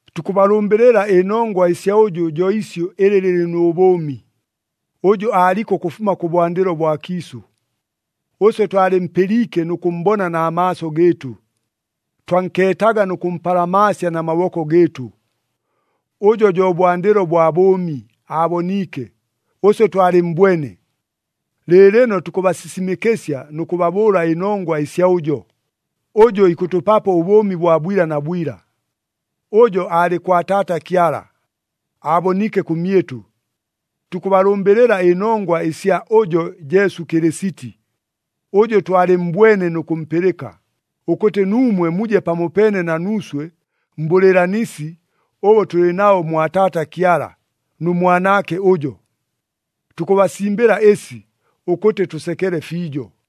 Tukʉbalʉmbɨlɨla ɨnongwa ɨsya ʉjʉ jo isyʉ ɨlɨ lɨlɨ nʉ bʉʉmi, ʉjʉ aaliko ʉkʉfuma kʉbwandɨlo bwa kiisʉ. Ʉswe twalɨmpɨliike nʉ kʉmmbona na maaso gɨɨtʉ, twankeetaga nʉ kʉmpalamaasya na maboko gɨɨtʉ. Ʉjo jo bwandɨlo bwa bʉʉmi aaboniike, ʉswe twalɨmmbwene. Lɨɨlɨno tukʉbasisimɨkɨsya nʉ kʉbabʉʉla ɨnongwa ɨsya ʉjo, ʉjʉ ikʉtʉpapo ʉbʉʉmi bwa bwila na bwila. Ʉjo aalɨ kwa Taata Kyala, aaboniike kʉmyɨtʉ. Tukʉbalʉmbɨlɨla ɨnongwa ɨsya ʉjo Jesu Kɨlɨsiti, ʉjʉ twalɨmmbwene nʉ kʉmpɨlɨka, ʉkʉtɨ nuumwe muje pamopeene na nuuswe mbʉlɨɨlanisi ʉbʉ tʉlɨ nabo mwa Taata Kyala, nʉ Mwanaake ʉjo. Tukʉbasimbɨla ɨsi, ʉkʉtɨ tʉsekele fiijo.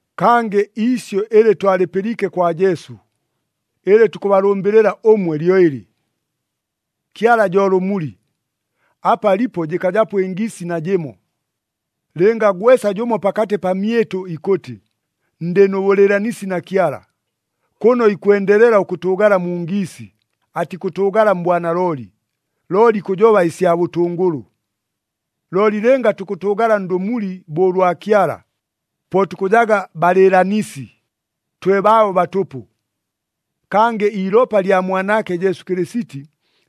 Kangɨ iisyʉ ɨlɨ twalɨpɨliike kwa Jesu, ɨlɨ tukʉbalʉmbɨlɨla ʉmwe lyo ɨlɨ. Kyala jo lʉmuli, apa alipo jɨkajapo ɨngiisi najɨmo. Lɨnga gwesa jʉmo pakatɨ pamyɨtʉ ikʉtɨ, “Ndɨ nʉ bʉlɨɨlanisi na Kyala,” kʉno ikwendelela ʉkʉtʉʉgala mu ngiisi, atikʉtʉʉgala mbwanalooli, looli ikʉjoba ɨsya bʉtʉngʉlʉ. Looli lɨnga tukʉtʉʉgala ndʉmuli bo ʉlwa Kyala, po tukʉjaga balɨɨlanisi, twe baabo batʉpʉ. Kangɨ iilopa lya Mwanaake Jesu Kɨlɨsiti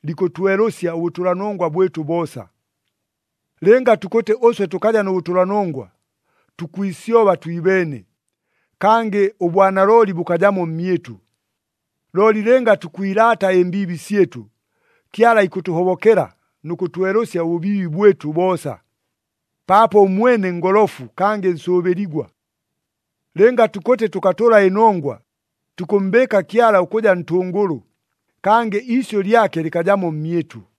likʉtwelʉsya ʉbʉtʉlanongwa bwɨtʉ boosa. Lɨnga tukʉtɨ ʉswe tʉkaja nʉ bʉtʉlanongwa, tukwisyoba twibeene, kangɨ ʉbwanalooli bʉkajamo mmyɨtʉ. Looli lɨnga tukwilaata ɨmbiibi syɨtʉ, Kyala ikʉtʉhobokela nʉ kʉtwelʉsya ʉbʉbiibi bwɨtʉ boosa, paapo ʉmwene ngolofu kangɨ nsʉʉbɨligwa. Lɨnga tukʉtɨ tʉkatʉla ɨnongwa, tukʉmmbɨɨka Kyala ʉkʉja ntʉngʉlʉ, kangɨ iisyʉ lyake lɨkajamo mmyɨtʉ.